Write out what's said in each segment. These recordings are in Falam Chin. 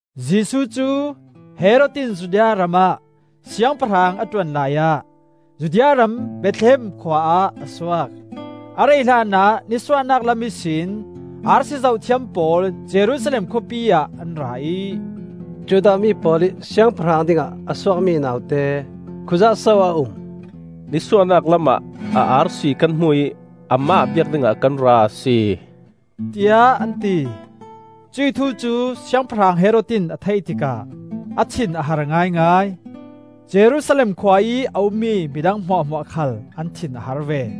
Jesuh cu Herod in Judea ram ah siangpahrang a ṭuan laiah, Judea ram Bethlehem khua ah a suak. A rei hlanah nisuahnak lam ihsin arsi zohthiam pawl Jerusalem khawpi ah an ra ih, “Judah mi pawl ih Siangpahrang dingah a suakmi naute khuiah so a um? Nisuahnak lamah a arsi kan hmu ih amah biak dingah kan ra a si,” tiah an ti. Cuih thu cu siangpahrang Herod in a theih tikah a thin a har ngaingai. Jerusalem khua ih a ummi midang hmuahhmuah khal an thin a har ve.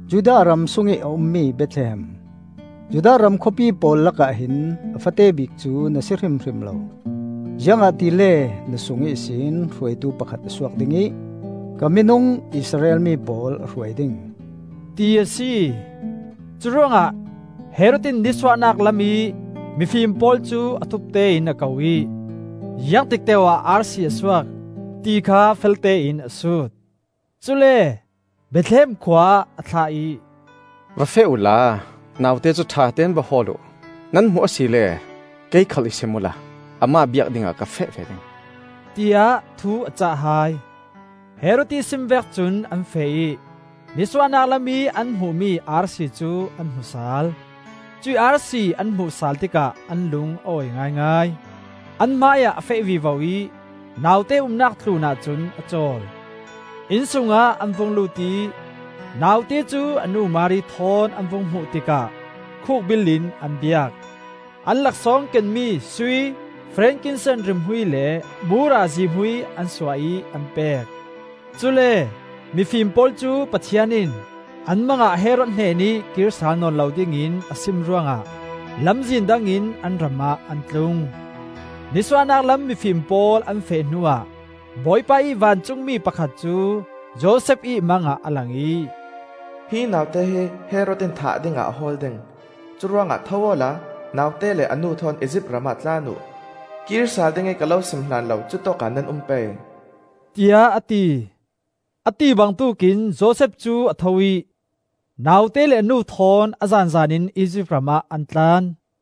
“Judah ram sungih a ummi Bethlehem, Judah ram khawpi pawl lakah hin a fate bik cu na si hrimhrim lo. Ziangahtile na sung ihsin hruaitu pakhat a suak ding ih, Ka minung Israel mi pawl a hruai ding,” ti a si. Curuangah Herod in nisuahnak lamih mifim pawl cu a thupte in a ko ih, ziangtik teu-ah arsi a suak, ti kha feltein a sut. Cule Bethlehem khua ah a thlah ih, “Va feh uhla naute cu ṭhatein va hawl uh; nan hmuh asile kei khal i sim uhla amah biak dingah ka feh ve ding,” tiah thu a cah hai. Herod ih sim vek cun an feh ih nisuahnak lamih an hmuhmi arsi cu an hmu sal. Cuih arsi an hmuh sal tikah an lung a awi ngaingai. An hmaiah a feh vivo ih naute umnak tlunah cun a cawl. Inn sungah an vung lut ih naute cu a nu Mari thawn an vung hmuh tikah khukbil in an biak. An laksawng kenmi sui, frankincense rimhmui le mura zihmui an suah ih an pek. Cule mifim pawl cu Pathian in an mang ah Herod hnenih kir sal nawn lo dingin a sim ruangah lamzin dangin an ram ah an tlung. Nisuah lam mifim pawl an feh hnuah Bawipa ih vancungmi pakhat cu Josef ih mangah a lang ih, “Hi naute hi Herod in thah dingah a hawl ding. Curuangah tho awla naute le a nu thawn Izipt ramah tlan uh. Kir sal ding i ka lo sim hlan lo cutawkah nan um pei,” tiah a ti. A ti bangtuk in Josef cu a tho ih naute le a nu thawn a zanzan in Izipt ram ah an tlan.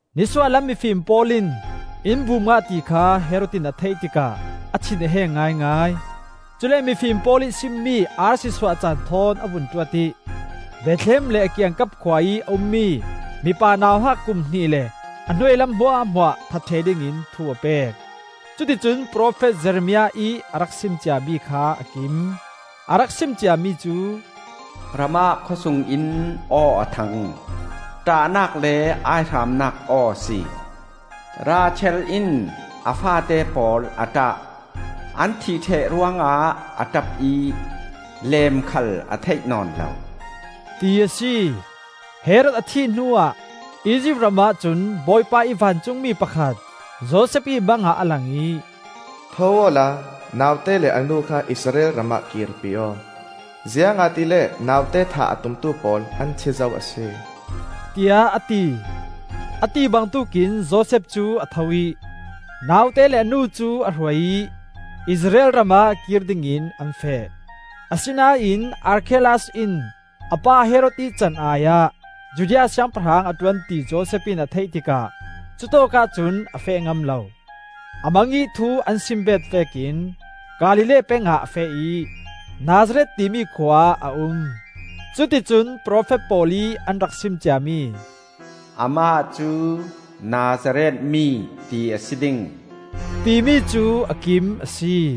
Nisuah lam mifim pawl in in bum ngah ti kha Herod in a theih tikah a thin a heng ngaingai. Cule mifim pawl ih simmi arsi suah caan thawn a vun tuat ih Bethlehem le a kiangkap khua ih a ummi mipa nauhak kum hnih le a hnuailam hmuahhmuah that ṭheh dingin thu a pek. Cuticun profet Jeremiah ih a rak sim ciami kha a kim. A rak sim ciami cu: “Ramah khawsung in aw a thang, ṭahnak le aihramnak aw a si. Rachel in a faate pawl a ṭah; An thih ṭheh ruangah a ṭap ih, Leem khal a theih nawn lo,” ti a si. Herod a thih hnuah Izipt ramah cun Bawipa ih vancungmi pakhat Josef ih mangah a lang ih, “Tho awla naute le a nu kha Israel ram ah kirpi aw, ziangahtile naute thah a tumtu pawl an thi zo a si,” tiah a ti. A ti bangtuk in Josef cu a tho ih naute le a nu cu a hruai ih Israel ram ah kir dingin an feh. Asinain Arkhelaus in a pa Herod ih can-ai ah Judea siangpahrang a ṭuan ti Josef in a theih tikah cutawkah cun a feh ngam lo. A mangih thu an sim bet vekin Galilee peng ah a feh ih, Nazareth timi khua ah a um. Cuticun profet pawl ih an rak sim ciami, “Amah cu Nazareth mi ti a si ding,” timi cu a kim a si.